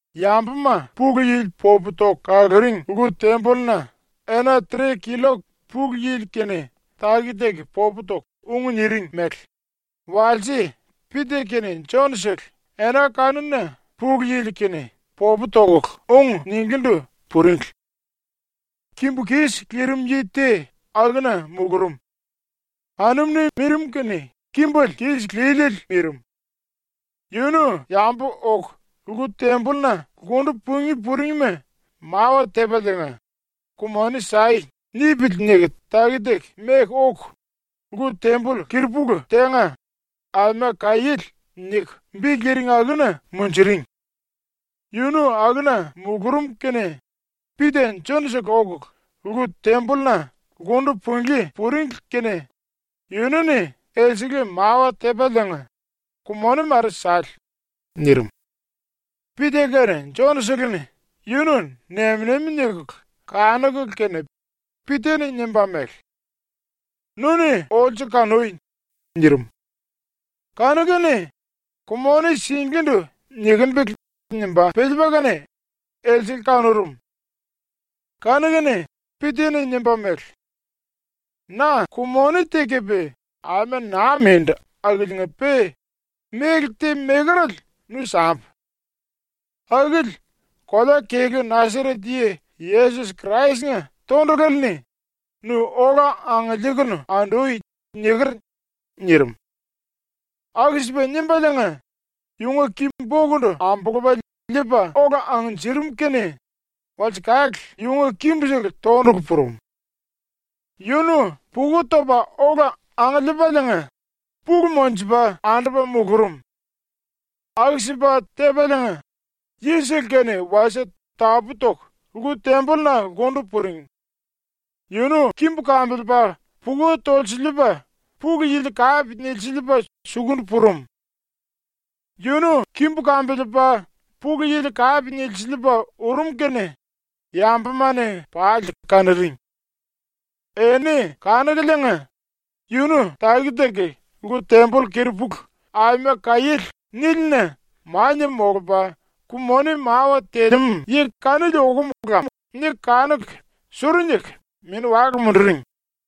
Yambuma ⸤Pulu Yili popu toku kaluring⸥ lku-tembolluna ena tre killok Pulu Yili-kene taki-taki popu toku ung niring mele walse Pita kene Jon-sele ena kanuna Pulu Yili-kene popu tokulu ung ninglíndu puringli. Kimbu kis lirim yi te akuna mulurum. Anum-ni mirim kene kimbele kis líliele mirim. ‘Yunu yambu oku lku-tembolluna lkundu pungí puringma mawa tepaliinga “Ku-moni sai.” nipili.’ niku taki-taki meku oku lku-temboll keri-pulu tenga ‘Aima Kaiéle’ niku bi liring akuna munjuring. Yunu akuna mulurum kene Pita Jon-sele okulu lku-tembolluna lkundu punglí puringli kene yunu-ni elsele mawa tepaliinga “Ku-moni mare sale.” nirim. Pita kene Jon-seleni yunu nem-nemi nikulu kanukulu kene Pita-ni nimba mele: “Nu-ni olsu kanui.” nirim. Kanu-kene ‘Ku-moni singlíndu nikimbili.’ nimba piliipa kene elsele kanurum. Kanu-kene Pita-ni nimba mele: “Na ku-moni te kepe aima naa mindu akiliinga-pe méle te mekerale nu sambu. Akili kolea-kelú Nasaret Yi Yesos Krais-nga tondulale-ni ‘Nu ola angiliikunu andui.’ niker.” nirim. Aku-sipa nimbaliinga yunga ki-bokundu ambulupa liipa ola angnjirim kene walsekale yunga kimbusele tondulu purum. Yunu puka topa ola angiliipaliinga pulu monjupa andupa mulurum. Aku-sipa tepaliinga yisele-kene wasie tapú-toku lku-tembolluna lkundu puring. Yunu kimbu kambiliipa puka tolsiliipa Pulu Yili kape nilsiliipa sukundu purum. Yunu kimbu kambiliipa Pulu Yili kape nilsiliipa urum kene yambuma-ni pali kanuring. Enini kanukuliinga, ‘Yunu taki-taki lku-temboll keri-pulu ‘Aima Kaiéle’ nílina mania molupa ku-moni mawa telemú yi kanili okum lam.’ niku kanuku suru niku mini-wale munduring.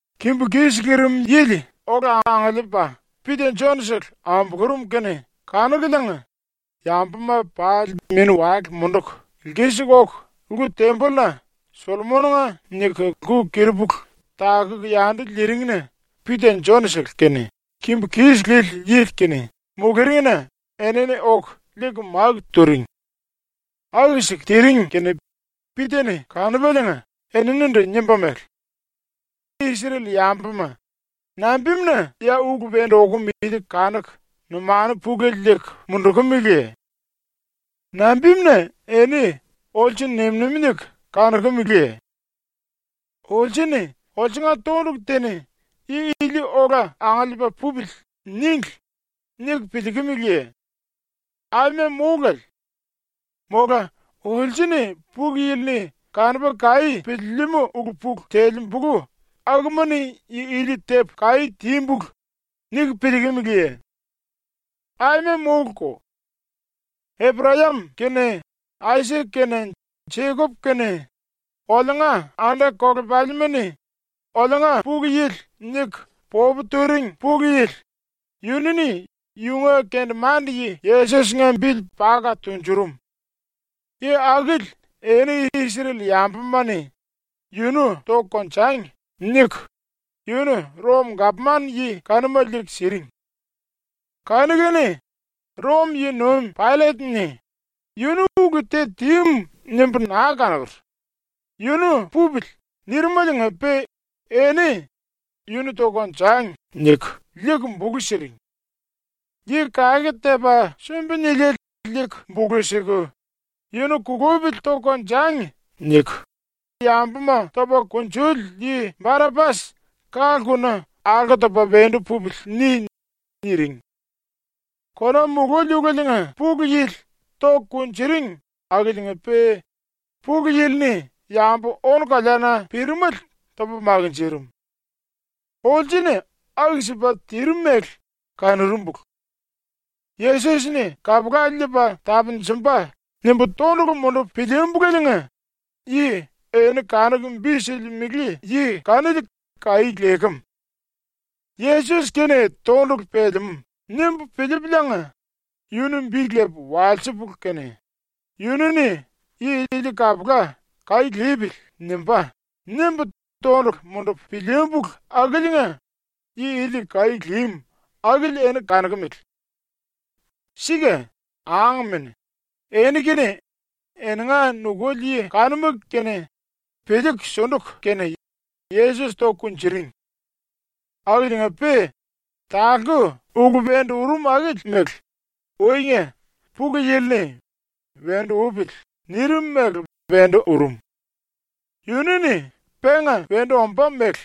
Kimbu kis lirim yili ola angiliipa Pita Jon-sele ambulurum kene kanukuliinga yambuma pali mini-wale munduku lkisiku oku lku-tembolluna ‘Sollomon-nga’ niku lku keri-pulu takuku yandu liiring-na Pita Jon-sele kene kimbu kis lili yili kene muluringna enini oku liiku máku turing. Aku-siku tiring kene Pita-ni kanupaliinga eninindu nimba mele: “Isrel-yambuma, nambimuna ya ulu wendu okum ili kanuku numanu pulele liiku mundukumiliye? Nambimuna eni olsu nem-nemi niku kanokumeleye? ‘Olsu-ni olsunga tondulu te-ni “Yi ili ola angiliipa pupili.” níngli.’ niku piliikimiliye? Aima mólale. Mola ‘olsu-ni Pulu Yili-ni kanupa kaí piliilimú ulu-pulu telembulu akuma-ni yi ili tepu kaí tímbulu.’ niku piliikimiliye? Aima móluko. Eprayam kene Aisak kene Jekop kene oliunga anda-kolepalima-ni “Oliunga Pulu Yili.” niku popu turing Pulu Yili, yunu-ni yunga kendemande-yi Yesos-nga bili paka tunjurum. Yi akili eni Isrel-yambuma-ni “Yunu toku konjangi.” niku yunu Rom-gapman-yi kanuma liiku siring. Kanu-kene Rom-yi-nuim Paillet-ni “Yunu ulu te tímu nimbu naa kanokur. Yunu pupili.” nirimeliinga-pe eni “Yunu toku konjangi.” niku liiku bulu siring. Yi Kake Tepa Sumbi Niliele liiku bulu siku, “Yunu kulupili toku konjangi.” niku, yambuma topa kunjuli yi Barapas ka-lkuna “‘Alko topa wendu pupili.’ ni.” niring. Kona mululi ulelenga pulu yili toku kunjuring akiliinga-pe Pulu Yili-ni yambu-ónu-koleana pirimele topa makinjirim. Olsu-ni aku-sipa tirim mele kanurumbulu. ‘Yesos-ni kapula liipa tapunjumba.’ nimbu tondulu mundupu pilíímbuleliinga yi eni kanuku bi silimele yi kanili kaí lekem. ‘ ‘Yesos-kene tondulu pelemú.’ nimbu piliipuliinga yunu bi lepu walsipulu kene, yunu-ni yi ili kapula ‘Kaí lipili.’ nimbá.’ nimbu tondulu mundupu pilíímbulu akiliinga yi ili kaí límu akili eni kanokumele. “Sika, angmene, eni kene eninga nukuli yi kanuma kene piliiku sunduku kene Yesos toku kunjuring. Akiliinga-pe talku ulu wendu urum akili mele uinga Pulu Yili-ni ‘Wendu upili.’ nirim mele wendu urum. Yunu-ni penga wendu ombá mele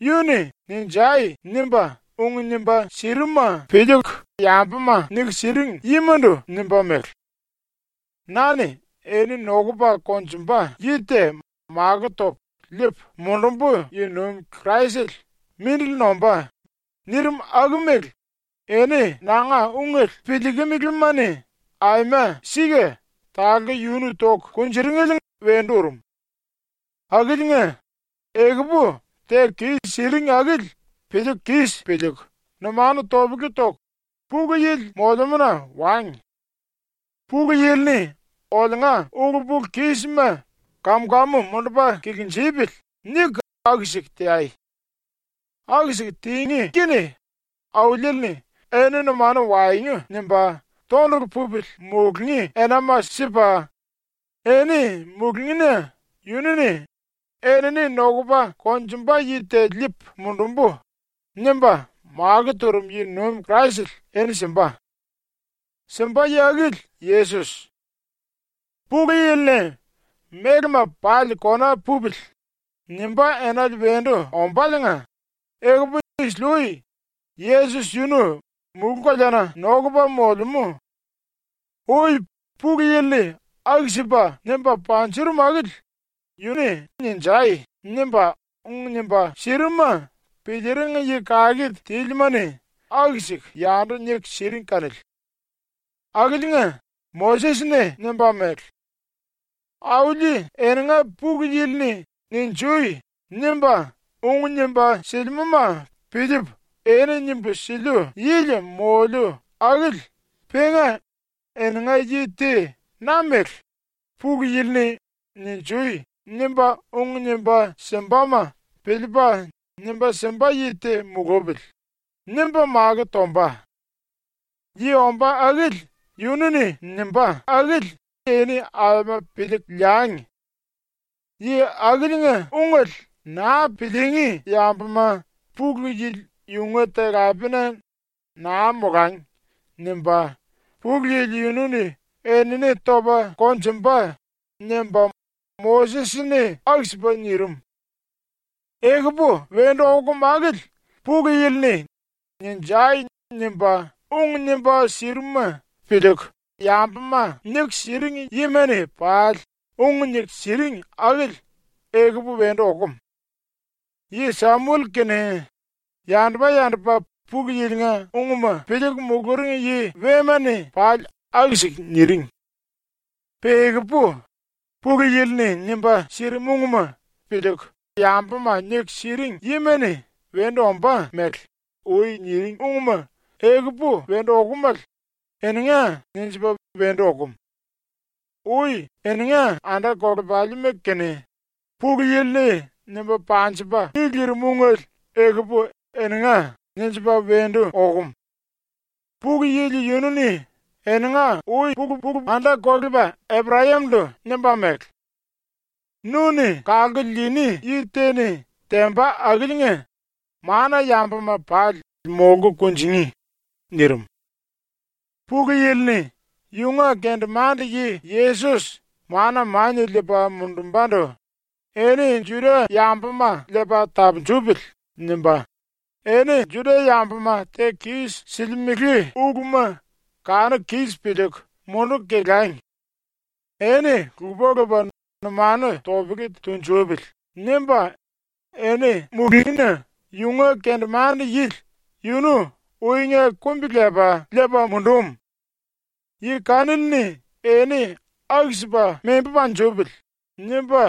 yu-ni “Ninjai!” nimba ung nimba sirimuma piliiku yambuma niku siring yimandu nimba mele: “Na-ni eni nokupa konjumba yi te makó topu liipu mundumbu yi-nuim Kraisele mindili nombá.” nirim aku mele eni nanga ungele piliikimilima-ni aima sika talku yunu toku kunjuringele wendu urum. “Akiliinga, ekupu teku kis-siring akili piliiku kis piliiku numanu topele toku, Pulu Yili molemúna wangi. ‘Pulu Yili-ni oliunga ulu-pulu-kísima kam-kamu mundupa kilinjipili.’ niku aku-siku teai. Aku-siku tingí kene Auliele-ni eni numanu waengu nimba tondulu pupili mulungí enama sipa, eni mulungína yunu-ni “Enini nokupa konjumba yi te liipu mundumbu.” nimba makó turum yi-nuim Kraisele eni simba. Simba yi akili Yesos. “Pulu Yili-ni ‘Mélema pali kona pupili.’ nimbá enale wendu ombáliinga ekupu isili-ui Yesos yunu mulú-koleana nokupa molemú. Ui Pulu Yili-ni aku-sipa nimba panjurum akili yu-ni “Ninjai!” nimba ung nimba sirimuma piliiring yi kake tílima-ni aku-siku yandu niku siring kanili. Akiliinga Moses-ni nimba mele: “Auli eninga Pulu Yili-ni “Ninju!” nimba ung nimba silimúma piliipu eni nimbu siliu yili moliu akili penga eninga yi te na-mele ‘Pulu Yili-ni “Ninjui!” nimba ung nimba simbama piliipa nimba simba yi te mulupili.’ nimba makó tomba. Yi ombá akili yunu-ni nimbá akili eni aima piliiku liangi. Yi akiliinga ungele naa piliingí yambuma Pulu Yili yunga talapena ‘Naa molangi.’ nimba Pulu Yili yunu-ni enini topa konjumba.” nimba Moses-ni aku-sipa nirim. “Ekupu wendu okum akili Pulu Yili-ni “Ninjai!” nimba ung nimba sirimuma piliiku yambuma niku siring yima-ni pali ung niku siring akili ekupu wendu okum. Yi Samuel kene, yandupa-yandupa Pulu Yilinga unguma piliiku muluring yi wema-ni pali aku-siku niring. Pe ekupu Pulu Yili-ni nimba sirimu ungma piliiku yambuma niku siring yima-ni wendu ombá mele ui niring ungma ekupu wendu okomale ‘Eninga.’ ninjipa wendu okum. Ui eninga anda-kolepalima-kene Pulu Yili-ni nimba panjipa mi lirim ungele ekupu ‘Eninga.’ ninjipa wendu okum. Pulu Yili yunu-ni eninga ui-pulu-pulu anda-kolepa Eprayam-ndu nimba mele: “Nu-ni kalku liini yi te-ni temba akiliinga mana-yambuma pali molku kunjingí.” nirim. Pulu Yili-ni yunga kendemande-yi ⸤Yesos⸥ mana mania liipa mundumbandu ‘Eni Juda-yambuma liipa tapunjupili.’ nimba ‘Eni Juda-yambuma teku kis-silimele uluma kanuku kis piliiku munduku kelangi. Eni lupa-lupa numanu topele tunjupili.’ nimba eni mulúngina yunga kendemande-yili yunu uinga kumbi-lepa liipa mundum. ‘Yi kanili-ni eni aku-sipa membu panjipili.’ nimba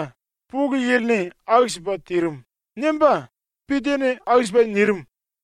Pulu Yili-ni aku-sipa tirim.” nimba Pita-ni aku-sipa nirim.